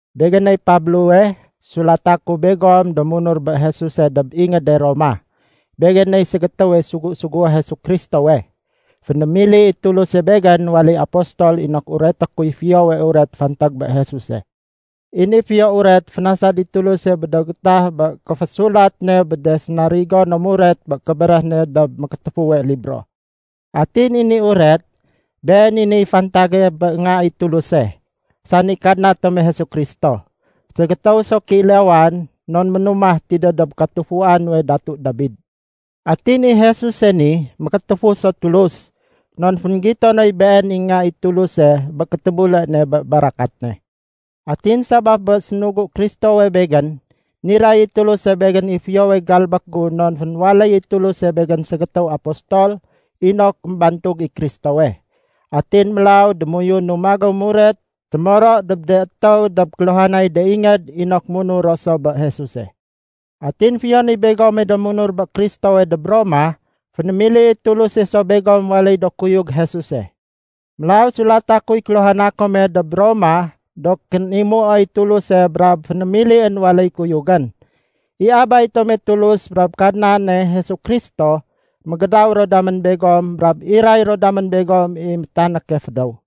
Begéney Pablowe sulata ku begom do munur bé Jesuse dob ingéde Roma. Begéney ségétéwe sugu-sugué Jesu Kristowe. Fénémili i Tuluse begén waléy apostol inok ureté kuy Fiyowe Uret fantag bé Jesuse. I ni Fiyo Uret, fénasad i Tuluse bé do gétah bé kéfésulat ne bé de sénarigo no muret bé kébéréh ne dob Mékétéfuwe Libro. Atin i ni uret, been i niy fantage bé Nga i Tuluse, sani Kadna tome Jesu Kristo. Ségétéw so kéilawan non ménumah tidéw dob katufua nuwe Datu Dabide. Atin i Jesuse ni, Mékétéfu so Tulus non fénggito noy Been i Nga i Tuluse bé kétébule ne bé barakat ne. Atin sabaf bé sénugu Kristowe begén, niray i Tuluse begén i fiyowe galbék gu non fénwaléy i Tuluse begén ségétéw apostol inok émbantug i Kristowe. Atin mélaw démoyunu magéw muret témoro dob de étéw dob kéluhanay de ingéd inok munur ro so bé Jesuse. Atin fiyon i begome do munur bé Kristowe dob Roma, fénémili i Tuluse so begom waléy do kuyug Jesuse. Mélaw sulata kuy kéluhana kome dob Roma do kénimuoy Tuluse brab fénémilién waléy kuyugén. I Abay tome Tulus brab Kadnane Jesu Kristo mégédaw ro damén begom brab iray ro damén begom i métanéke fédéw.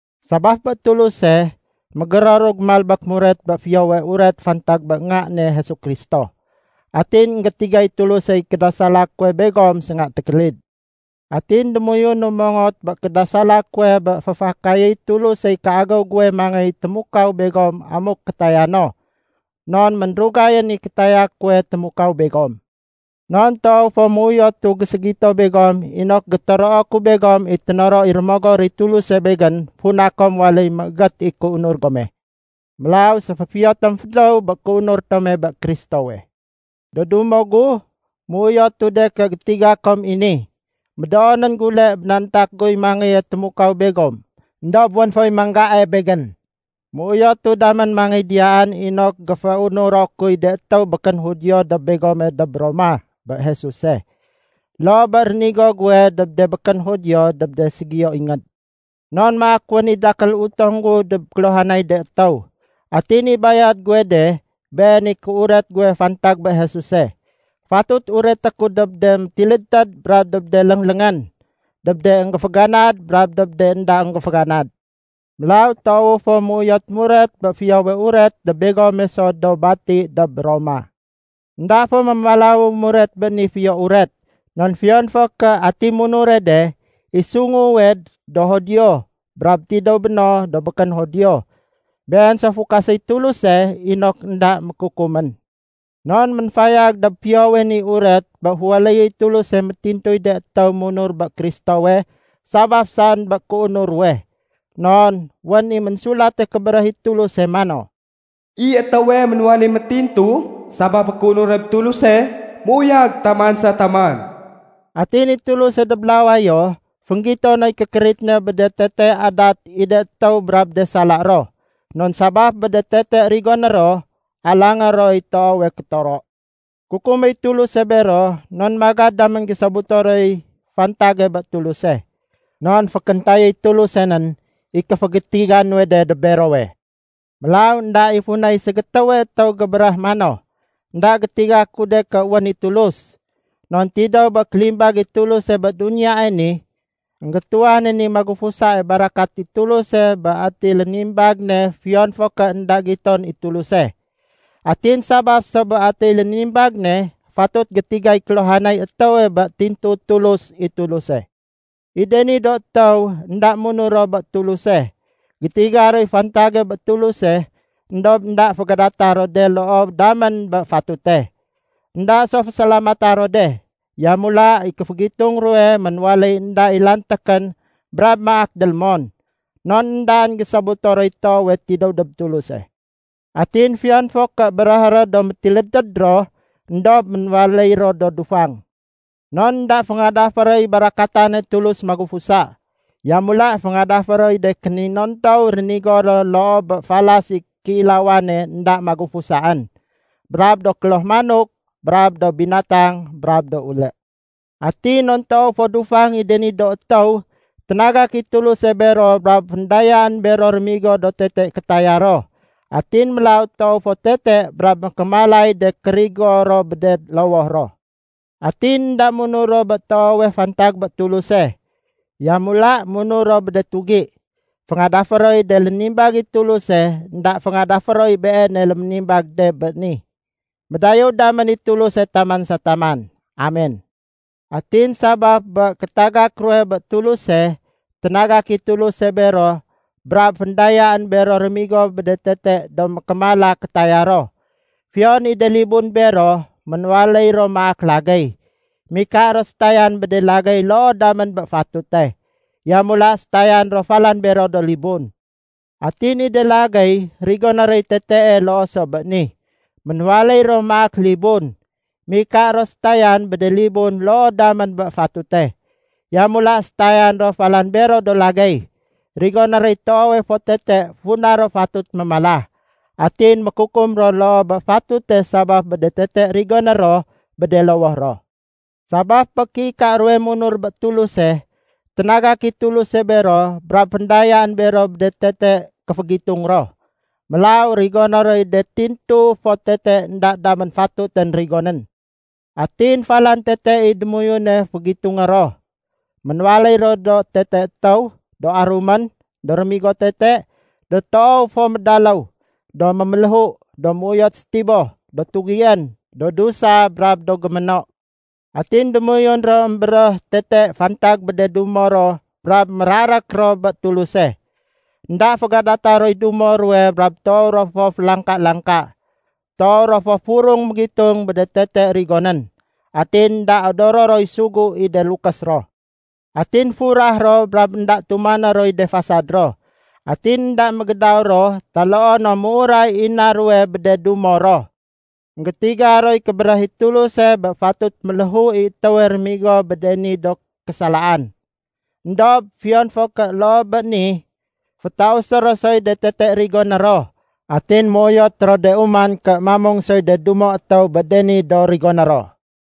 Sabaf bé Tuluse, mégéroru gémalbék muret bé Fiyowe Uret fantag bé Nga ne Jesu Kristo. Atin énggétigay Tulusey kédasala kuwe begom sénga tékélid. Atin démoyunu mongot bé kédasala kuwe bé féfakayéy Tulusey kéagéw guwe mangéy témukaw begom amuk kétaya no, non ménrugayén i kétaya kuwe témukaw begom. Non toow fo méuyotu géségito begom inok gétoroo ku begom i ténoro i Rémogor i Tuluse begén funa kom waléy méégét i kéunur gome. Mélaw séféfiyo tom fédéw bé kéunur tome bé Kristowe. Do dumo gu, méuyotu ké gétiga kom i ni, médoonén gule bénantak guy mangéye témukaw begom éndob wén foy manggae begén. Méuyotu damén mangéy diyaan inok géféunuro kuy de étéw békén Judio dob begome dob Roma bé Jesuse, loo bé rénigo guwe dob de békén Judio dob de ségiyo ingéd. Non maak wén i dakél utong gu dob kéluhanay de étéw. Atin i bayad guwe de, been i kéuret guwe fantag bé Jesuse. Fatut ureté ku dob de métilédtéd brab dob de léngléngén, dob de énggéféganad brab dob de énda énggéféganad. Mélaw toowu fo méuyot muret bé Fiyowe Uret dob begome so do bati dob Roma. Enda fo mémalawu muret bé ni Fiyo Uret non fiyon fo ké ati munure de, i sunguwe do Judio brab tidéw béno do békén Judio, been so fukaséy Tuluse inok énda mékukumén. Non ménfayag dob Fiyowe ni Uret bé féwaléyéy Tuluse métintuy de étéw munur bé Kristowe sabaf saén bé kéunur ruwe. Non wén i Ménsulate Kébéréh i Tuluse mano, “I étéwe ménwaléy métintu sabaf bé kéunur ne bé Tuluse, méuyag taman sa taman.” Atin i Tuluse dob lawayo, fénggito noy kékérit ne bé de tete adat i de étéw brab de sala ro. Non sabaf bé de tete rigoné ro, alangé roy toowe kétoro. Kukuméy Tuluse bero non magad damén gésobuto roy fantage bé Tuluse. Non fénkéntayéy Tuluse nén i kéfégétiga nuwe de dob berowe. Mélaw énda i funay ségétéwe étéw gébéréh mano, “Enda gétiga ku de ké wén i Tulus.” Non tidéw bé kélimbag i Tuluse bé duniyae ni, énggétuwanén i magufusae barakat i Tuluse bé ati lénimbag ne fiyon fo ké énda giton i Tuluse. Atin sabaf so bé atiy lénimbag ne, fatut gétigay kéluhanay étéwe bé tintu Tulus i Tuluse. I de ni do étéw énda munur ro bé Tuluse, gétiga roy fantage bé Tuluse éndob énda fégadata ro de loo damén bé fatute. Enda so fésalamata ro de. Yamula i kéfégitung ruwe ménwaléy énda i lantékén brab maak délémon. Non éndaén gésobuto roy toowe tidéw dob Tuluse. Atin fiyon fo ké béréhé ro do métilédtéd ro, éndob ménwaléy ro do dufang. Non énda féngadafé roy barakatane Tulus magufusa, yamula féngadafé roy de kéninontow rénigo ro loo bé falas i kéilawane énda magufusaén, brab do kloh manok, brab do binatang, brab do ulé. Atin non toow fo dufang i de ni do étéw, ténagak i Tuluse bero brab féndayaén bero rémigo do tete kétaya ro. Atin mélaw toow fo tete brab mékémalay de kérigo ro bé de lowoh ro. Atin énda munur ro bé toowe fantag bé Tuluse. Yamula munur ro bé de tugi. Féngadafé roy de lénimbag i Tuluse, énda féngadafé roy Beene léménimbag bé de ni. Médayéw damén i Tuluse taman sa taman. Amen. Atin sabaf bé kétagak ruwe bé Tuluse, ténagak i Tuluse bero brab féndayaén bero rémigo bé de tete do mékémala kétaya ro. Fiyon i de libun bero, ménwaléy ro maak lagéy. Mika ro sétayan bé de lagéy loo damén bé fatute. Yamula sétayan ro falan bero do libun. Atin i de lagéy rigoné roy tetee loo so bé ni. Ménwaléy ro maak libun. Mika ro sétayan bé de libun loo damén bé fatute. Yamula sétayan ro falan bero do lagéy. Rigoné roy toowe fo tete funa ro fatut mémala. Atin mékukum ro loo bé fatute sabaf bé de tete rigoné ro bé de lowoh ro. Sabaf bé kéika ruwe munur bé Tuluse, ténagak i Tuluse bero brab féndayaén bero bé de tete kéfégitung ro. Mélaw rigoné roy de tintu fo tete énda damén fatutén rigonén. Atin falan tete i démoyune fénggitung ro. Ménwaléy ro do tete étéw, do arumén, do rémigo tete, do toow fo médaléw, do méméléhu, do méuyot sétiboh, do tugién, do dusa, brab do géméno. Atin démoyun émbéréh ro tete fantag bé de dumo ro brab mérarék ro bé Tuluse. Enda fégadata roy dumo ruwe brab toow ro fo félangka-langka. Toow ro fo furung mégitung bé de tete rigonén. Atin énda odoro roy sugu i de lukés ro. Atin furah ro brab énda tumané roy de fasad ro. Atin énda mégédaw ro taloo no méuray i na ruwe bé dumo ruwe. Enggétiga roy kébéréh i Tuluse bé fatut méléhu i étéwe rémigo bé de ni do késalaan. Endob fiyon fo ké loo bé ni, fétausé ro soy de tete rigoné ro, atin méuyot ro de uman ké mamung soy de dumo étéw bé de ni do rigoné ro.